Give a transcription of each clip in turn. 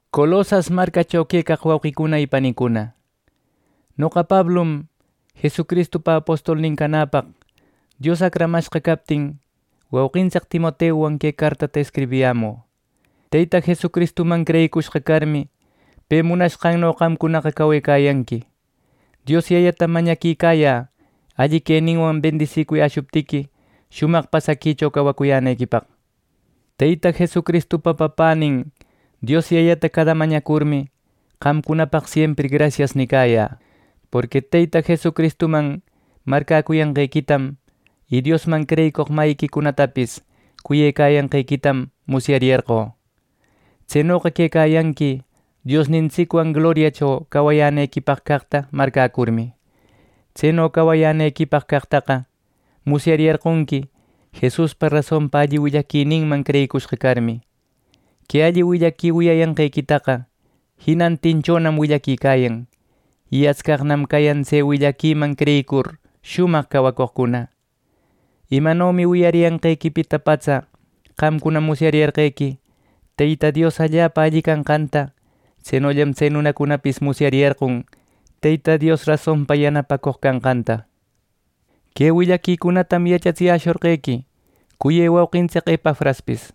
Colosas marcacho quecaq wauqicuna y panicuna, noqa Pablum, Jesucristupa apostolnin canäpaq Dios acramashqa captin, wauqintsic Timoteuwan que cartata escribiyämü. Teyta Jesucristuman creyicushqa carmi, pe munashqanno qamcunaqa cawecayanqui. Dios Yayatam mañaquicayä alli queninwan bendisicuyäshuptiqui, shumaq pasaquicho cawacuyänequipaq. Teyta Jesucristupa Papänin Dios Yayata cada mañacurmi, qamcunapaq siempri “Grasias” nicayä. Porqui Teyta Jesucristuman marcäcuyanqequitam y Diosman creyicoq mayiquicunatapis cuyecayanqequitam musyariyarqö. Tsenoqa quecayanqui Diosnintsicwan gloriacho cawayänequipaq caqta marcäcurmi. Tseno cawayänequipaq caqtaqa musyariyarqonqui, Jesuspa rasonpa alli willaquininman creyicushqa carmi. Que alli willaqui wiyayanqequitaqa jinantinchonam willaquicayan, y atscaqnam cayan tse willaquiman creyicur shumaq cawacoqcuna. Imanomi wiyariyanqequipita patsa qamcuna musyariyarqequi Teyta Dios allapa alli canqanta; tsenollam tse nunacunapis musyariyarqon Teyta Dios rasonpa yanapacoq canqanta. Que willaquicunatam yachatsiyäshorqonqui cuyë wauqintsic Epafraspis.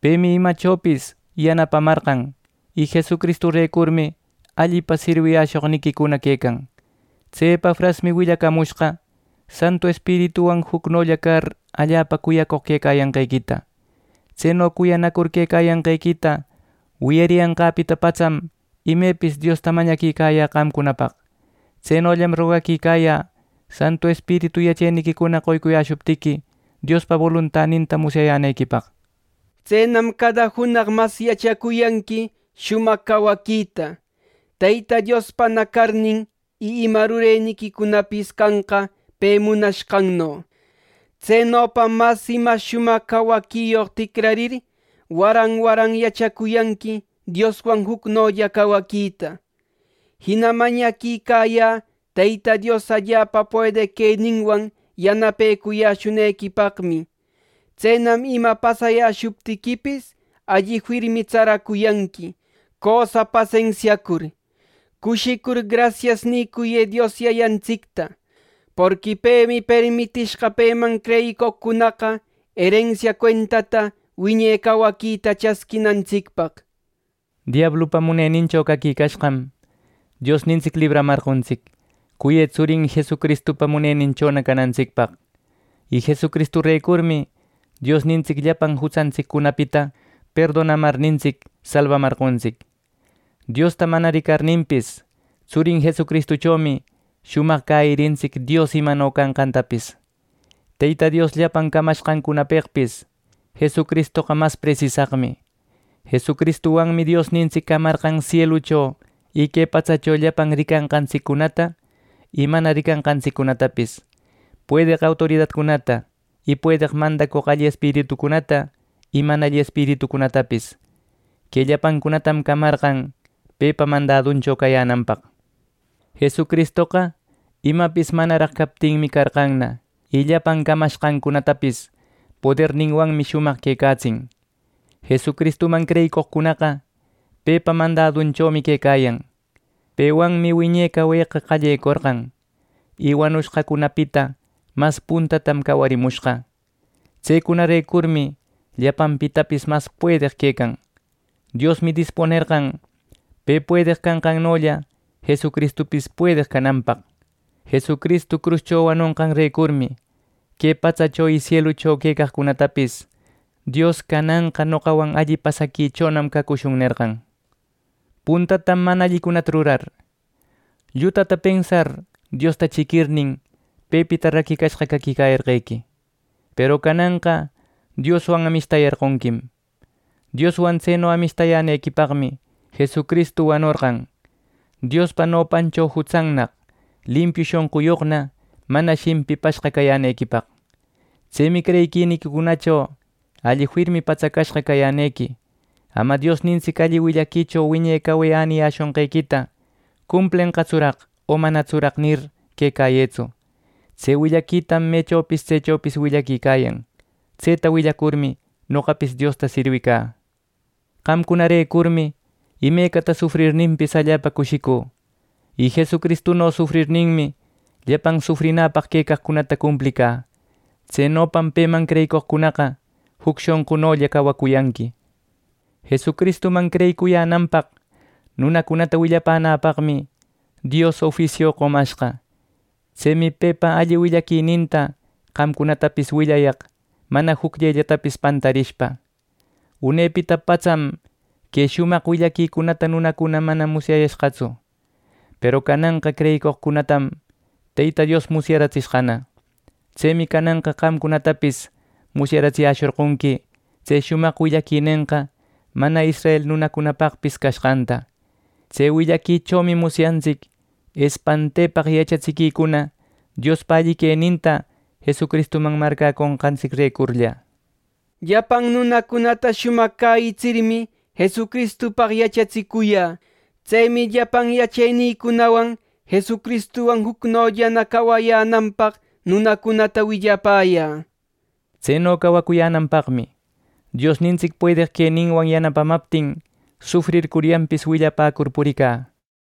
Pemi imachopis yanapamarqan, y Jesucristurecurmi allipa sirwiyäshoqniquicuna quecan. Tse Epafrasmi willacamushqa Santu Espirituwan jucnolla car allapa cuyacoq quecayanqequita. Tseno cuyanacur quecayanqequita wiyariyanqäpita patsam, imepis Diosta mañaquicayä qamcunapaq. Tsenollam rogaquicayä Santu Espiritu yacheniquicuna qoycuyäshuptiqui, Diospa boluntaninta musyayänequipaq. Tsenam cada junaq mas yachacuyanqui shumaq cawaquita, Teyta Diospana carnin, y ima rureniquicunapis canqa pe munashqanno. Tsenopam mas y mas shumaq cawaquiyoq ticrarir, waran waran yachacuyanqui Dioswan jucnolla cawaquita. Jina mañaquicayä Teyta Dios allapa puedeq queninwan yanapecuyäshunequipaqmi; tsenam ima pasayäshuptiquipis, alli firmi tsaracuyanqui cösa pasensiacur. Cushicur, “Grasias” nicuyë Dios Yayantsicta, porqui pemi permitishqa peman creyicoqcunaqa erensia cuentata wiñe cawaquita chasquinantsicpaq. Diablupa munenincho caquicashqam, Diosnintsic libramarqontsic cuyë tsurin Jesucristupa muneninchona canantsicpaq. Y Jesucristurecurmi Diosnintsic llapan jutsantsiccunapita perdonamarnintsic salbamarqontsic. Diosta mana ricarninpis, tsurin Jesucristuchomi shumaq cäyirintsic Dios imano canqantapis. Teyta Dios llapan camanqancunapeqpis Jesucristoqa mas presisaqmi. Jesucristuwanmi Diosnintsic camarqan sielucho y que patsacho llapan ricanqantsiccunata y mana ricanqantsiccunatapis, puedeq autoridacunata, y puedeq mandacoq alli espiritucunata y mana alli espiritucunatapis. Que llapancunatam camarqan pepa mandaduncho cayänanpaq. Jesucristoqa imapis manaraq captinmi carqanna, y llapan camashqancunatapis poderninwan shumaq quecatsin. Jesucristuman creyicoqcunaqa pepa mandadunchomi quecayan. Pewanmi wiñe caweqa qallecorqan. Y wanushqacunapita mas puntatam cawarimushqa. Tsecunarecurmi llapanpitapis mas puedeq quecan. Diosmi dispunerqan pe puedeq canqannolla Jesucristupis puedeq cananpaq. Jesucristu cruscho wanonqanrecurmi que patsacho y sielucho quecaqcunatapis Dios “Cananqa noqawan alli pasaquichonam cacushun” nerqan. Puntatam mana allicunata rurar, llutata pensar Diosta chiquirnin, pepita raquicashqa caquicayarqequi. ˻Peru cananqa Dioswan amishtayarqonquim.˼ Dioswan tseno amishtayänequipaqmi Jesucristu wanorqan, Diospa nopancho jutsannaq, limpiu shonquyoqna, mana shimpipashqa cayänequipaq. Tsemi creyiquiniquicunacho alli firmi patsacashqa cayänequi. Ama Diosnintsic alli willaquicho wiñe cawe äniyäshonqequita “¿cumplenqatsuraq, o manatsuraq?” nir quecayëtsu. Tse willaquitam mechopis tsechopis willaquicayan. Tseta willacurmi, noqapis Diosta sirwicä. Qamcunarecurmi imecata sufrirninpis, allapa cushicü; y Jesucristuno sufrirninmi, llapan sufrinäpaq quecaqcunata cumplicä. Tsenopam peman creyicoqcunaqa juc shonqunolla cawacuyanqui. Jesucristuman creyicuyänanpaq nunacunata willapänäpaqmi, Dios ofisiu qomashqa. Tsemi pepa alli willaquininta qamcunatapis willayaq mana jucllellatapis pantarishpa. Unepita patsam que shumaq willaquicunata nunacuna mana musyayashqatsu. Peru cananqa creyicoqcunatam, Teyta Dios musyaratsishqana. Tsemi cananqa qamcunatapis musyaratsiyäshorqonqui tse shumaq willaquinenqa mana israel nunacunapaqpis cashqanta. Tse willaquichomi musyantsic espantepaq yachatsiquicuna Diospa alli queninta Jesucristuman marcäconqantsicrecurlla. Llapan nunacunata shumaq cäyitsirmi, Jesucristupaq yachatsicuyä. Tsemi llapan yachenïcunawan Jesucristuwan jucnollana cawayänanpaq nunacunata willapäyä. Tseno cawayänanpaqmi, Diosnintsic puedeq queninwan yanapamaptin, sufrircuryanpis willapäcur puricä.